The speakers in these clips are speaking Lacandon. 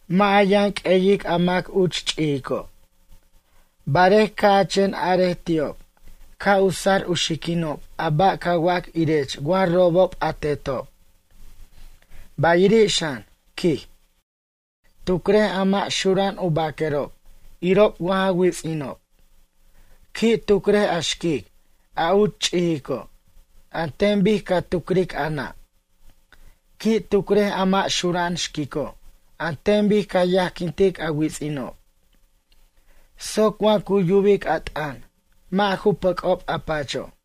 Mʌ' a yʌn q'ueyic a mac uch ch'ijico'. Barej ca' a chen arej ti'ob ca' u sar u xiquinob a ba' ca wac irech wa robob a tetob. Bayiri' xan, quij, tucrej a mʌ' xura'an u baquerob irob wa ja wits'inob. Qui' tucrej a xquic a uch ch'ijico' an ten bic ca tucric a nʌ'. Qui' tucrej a mʌ' xura'an xquico' an ten bic ca yajquintic a wits'inob. Soc wa cu yubic a t'ʌn mʌ' ju pʌcob a pacho'.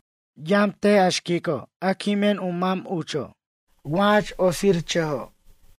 Yamt a xquico' a quimen u mam ucho' wa jach otsirchʌjo'.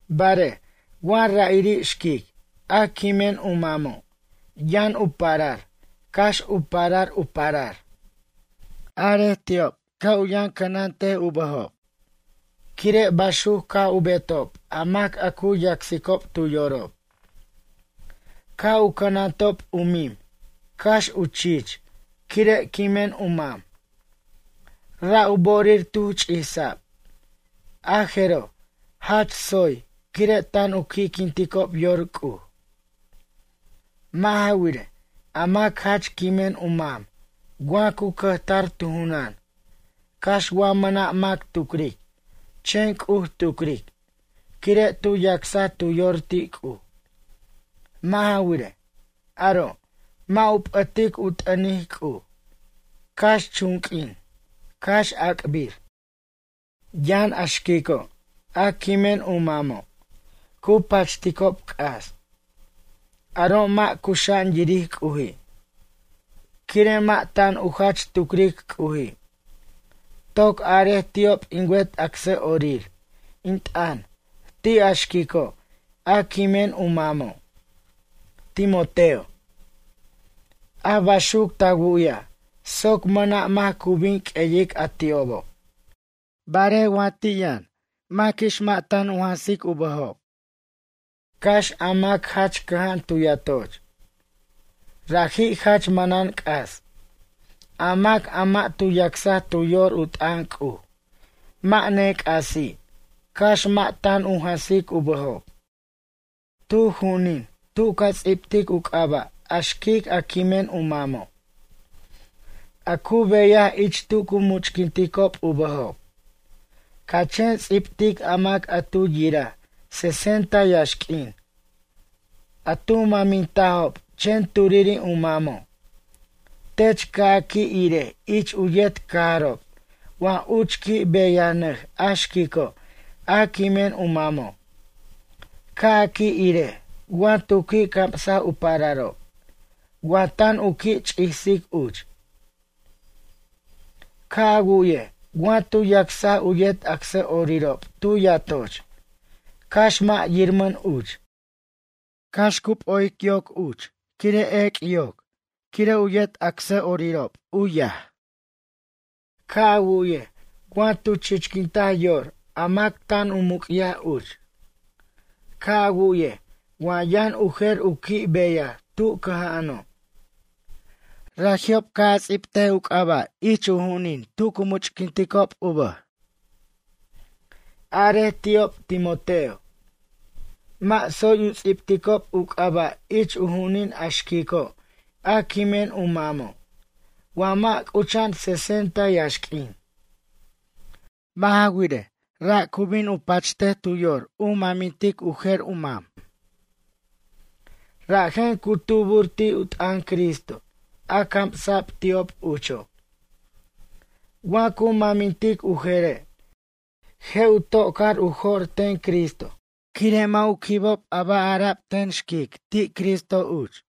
Barej wa ra'iri' xquic a quimen u mamo' yʌn u parar cax u parar u parar. Arej ti'ob ca' u yʌn cʌnant u bʌjob quire' baxuc ca' u betob a mac a cu yacsicob tu yorob. Ca' u cʌnantob u mim cax u chich quire' quimen u mam. Ra' u bo'orir tu ch'isa'b. A jeroj jach tsoy quire' tan u qui'quinticob yor C'uj. Mʌ' ja wirej, a mac jach quimen u mam wa cu cʌjtar tu junʌn. Cax wa mʌna' mac tucric chen C'uj tucric quire' tu yacsa tu yor ti' C'uj. Mʌ' ja wirej, aro' mʌ' u p'ʌtic u t'ʌnic C'uj, cax chun q'uin, cax ac'bir. Yʌn a xquico' a quimen u mamo', cu pachticob c'as. Aro' mʌ' cuxa'an yiric C'uji'. Quire' mʌ' tan u jach tucric C'uji'. Toc arej ti'ob in wet acsʌ'orir in t'ʌn ti' a xquico' a quimen u mamo', Timoteo. A baxuc ta wu'yaj soc mʌna' mac cu bin q'ueyic a ti'obo'. Barej wa ti' yʌn maquix mʌ' tan u jansic u bʌjob, cax a mac jach cʌja'an tu yatoch. Raji' jach manan c'as. A mac a mʌ' tu yacsaj tu yor u t'ʌn C'uj mʌ' nec'asi' cax mʌ' tan u jansic u bʌjob. Tu ju'unin tu ca ts'ibtic u c'aba' a xquic a quimen u mamo'. A cu beyaj ich tu cu much'quinticob u bʌjob. Ca chen ts'ibtic a mac a tu yiraj sesenta yaxq'uin. A tu mʌmintajob chen turiri' u mamo'. Tech ca' a qui' irej ich u yet cajarob wa uch qui' beyanʌj a xquico' a quimen u mamo'. Ca' a qui' irej wa tu qui' camsaj u pararob, wa tan u qui' ch'isic uch. Ca' a wu'ye wa tu yacsaj u yet acsʌ'orirob tu yatoch cax mʌ' yirmʌn uch. Cax u p'o'ic yoc uch quire' ec' yoc, quire' u yet acsʌ'orirob, u yaj. Ca' a wu'yej wa tu chichquintaj yor a mac tan u muc'yaj uch. Ca' a wu'yej wa yʌn u jer u qui' beyaj tu cʌja'ano'. Raji'ob ca' a ts'ibt u c'aba' ich u ju'unin tu cu much'quinticob u bʌj. Arej ti'ob Timoteo. Mʌ' tsoy u ts'ibticob u c'aba' ich u ju'unin a xquico' a quimen u mamo', wa mʌ' c'ucha'an sesenta yaxq'uin. Mʌ' ja wirej, ra' cu bin u pachtej tu yor u mʌmint u jer u mam. Rajen cu tubur ti' u t'ʌn Cristo a camsa'b ti'ob ucho'. Wa cu mʌmintic u jere', je' u ta'ca'r u jo'r ten Cristo quire' mʌ' u quibob a ba' ara'b ten xquic ti' Cristo uch.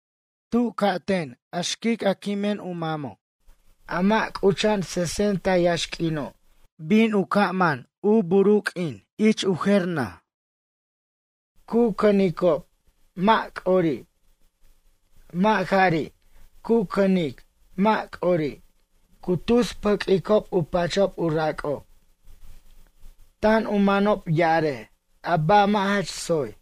Tu ca'ten a xquic a quimen u mamo', a mʌ' c'ucha'an sesenta yaxq'uino', bin u ca' sut u bur u q'uinin ich u jer naj. Cu cʌnicob mʌ' c'ori'. Mʌ' jari' cu cʌnic mʌ' c'ori', cu tus pʌq'uicob u pachob u rac'ob. Tan u manob ya'arej a ba' mʌ' jach tsoy.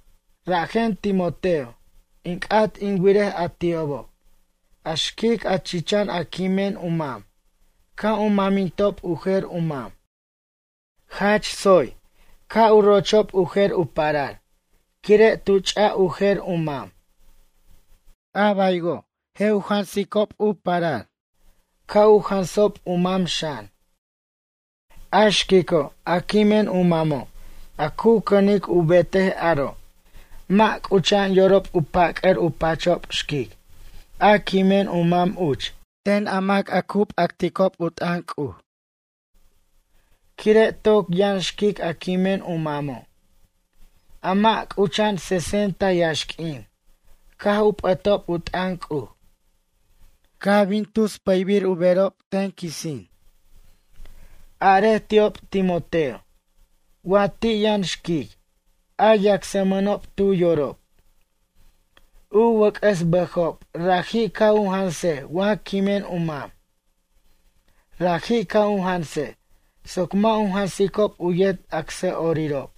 Rajen Timoteo in c'at in wirej a ti'obo', a xquic a chichan a quimen u mam, ca' u mʌmintob u jer u mam. Jach tsoy, ca' u rochob u jer u parar quire' tu ch' u jer u mam. A baywo' je' u jansicob u parar. Ca' u jansob u mam xan. A xquico' a quimen u mamo' a cu cʌnic u betej aro' mʌ' c'ucha'an yorob u pac'a'r u pachob xquic a quimen u mam uch ten a mac a u p'acticob u t'ʌn C'uj. Quire' toc yʌn xquic a quimen u mamo'. A mʌ' c'ucha'an sesenta yaxq'uin caj ju p'ʌtob u t'ʌn C'uj. Caj bin u tus pʌybir u berob ten quisin. Arej ti'ob Timoteo. Wa ti' yʌn xquic, a yacsmʌnob tu yorob. U wʌc'ʌs bʌjob raji' ca' u janse wa quimen u mam. Raji' ca' u jansej soc mʌ' u jansicob u yet acsʌ'orirob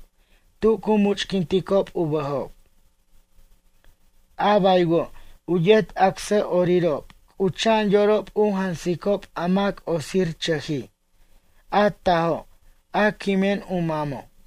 tu cu much'quinticob u bʌjob. A baywo' u yet acsʌ'orirob c'ucha'an yorob u jansicob a mac otsirchʌjij a tajo' a quimen u mamo'.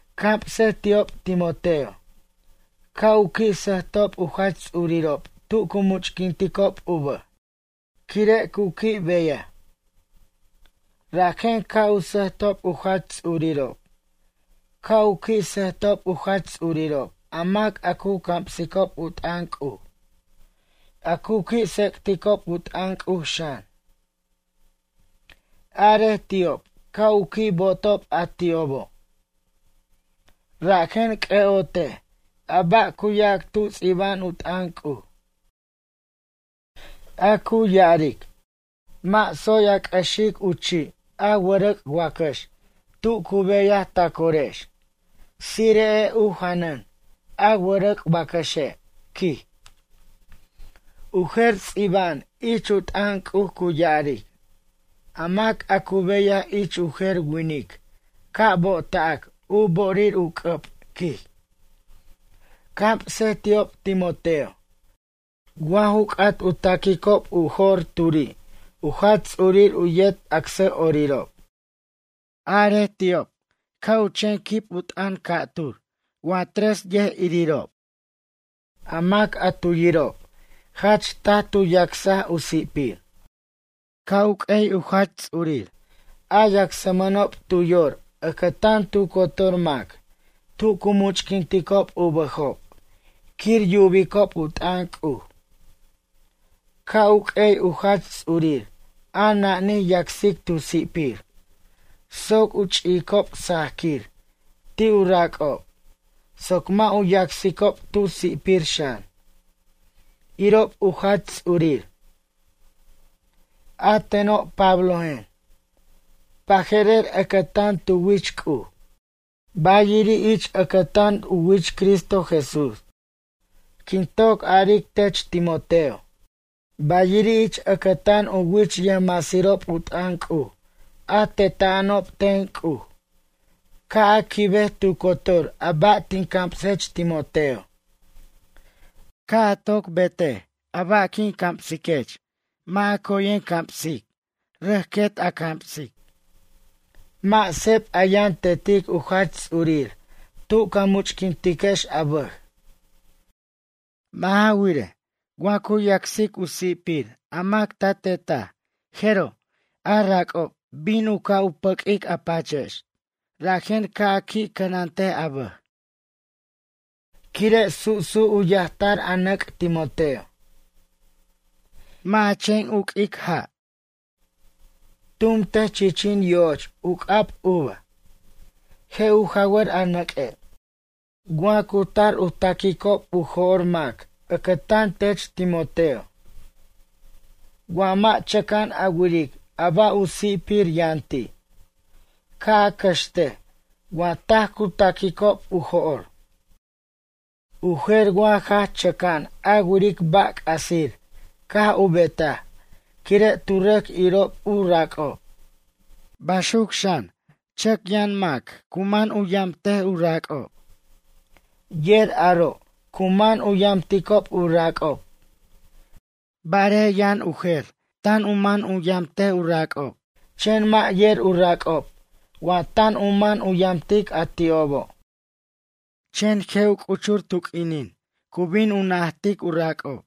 Camsej ti'ob Timoteo. Ca' u qui' sʌjtob u jach ts'urirob tu cu much'quinticob u bʌj, quire' cu qui' beyaj. Rajen ca' u sʌjtob u jach ts'urirob. Ca' u qui' sʌjtob u jach ts'urirob a mac a cu camsicob u t'ʌn C'uj. A cu qui' tsec'ticob u t'ʌn C'uj, xan. Arej ti'ob ca' u qui' bo'otob a ti'obo'. Rajen c'ʌ'otej a ba' cu yac tu ts'iba'an t'ʌn C'uj. A cu ya'aric: “Mʌ' tsoy a c'ʌxic u chi' a wʌrʌc' wacʌx tu cu beyaj ta corex Tsire'ej u janan a wʌrʌc' wacʌxe',” quij. U jer ts'iba'an ich u t'ʌn C'uj cu ya'aric: “A mac a cu beyaj ich u jer winic ca' bo'ota'c u bo'orir u c'ʌb, quij.” Camsej ti'ob Timoteo. Wa ju c'at u ta'quicob u jo'r turi' u jach ts'urir u yet acsʌ'orirob. Arej ti'ob ca' u chen quib u t'ʌn ca'tur wa tres yʌjirirob. A mac a tu yirob jach taj tu yacsaj u si'pir. Ca' u q'uey u jach ts'urir a yacsmʌnob tu yor ʌcʌtan tu cotor mac tu cu much'quinticob u bʌjob quir yubicob u t'ʌn C'uj. Ca' u q'uey u jach ts'urir a nanij yacsic tu si'pir soc u ch'i'icob sajaquir ti' u rac'ob soc mʌ' u yacsicob tu si'pir xan, irob u jach ts'urir. A teno' Pablojen. Baje'rer ʌcʌtan tu wich C'uj. Bayiri' ich ʌcʌtan u wich Cristo Jesús, quin toc aric tech Timoteo. Bayiri' ich ʌcʌtan u wich yʌjmasirob u t'ʌn C'uj a teta'anob ten C'uj ca' a quibej tu cotor a ba' tin camsech Timoteo. Ca' a toc betej a ba' quin camsiquech mʌ' coyen a camsic, rʌc quet a camsic. Mʌ' seb a yʌn tetic u jach ts'urir tu ca much'quintiquex a bʌj. Mʌ' ja wirej, wa cu yacsic u si'pir a mac ta tetaj jero' a rac'ob bin u ca' pʌc' a pachex. Rajen ca' a qui' cʌnant a bʌj. Quire' su'su' u yajtar a nʌc' Timoteo. Mʌ' a chen uq'uic a ja'. Tumtej chichin yo'och u c'ab uva. Je' u jawʌr a nʌq'ue'. Wa cu tar u ta'quicob u jo'r mac ʌcʌtan tech Timoteo. Wa mʌ' chʌca'an a wiric a ba' u si'pir yʌn ti'. Ca' a cʌxtej wa taj cu ta'quicob u jo'r. U jer wa jach chʌca'an a wiric ba' c'asir caj u betaj quire' tu rʌc irob u rac'ob. Baxuc xan chʌc yʌn mac cu man u yamt u rac'ob. Yer aro' cu man u yamticob u rac'ob. Barej yʌn u jer tan u man u yamt u rac'ob chen mʌ' yer u rac'ob wa tan u man u yamtic a ti'obo'. Chen je' u c'uchur tu q'uinin cu bin najt u rac'ob.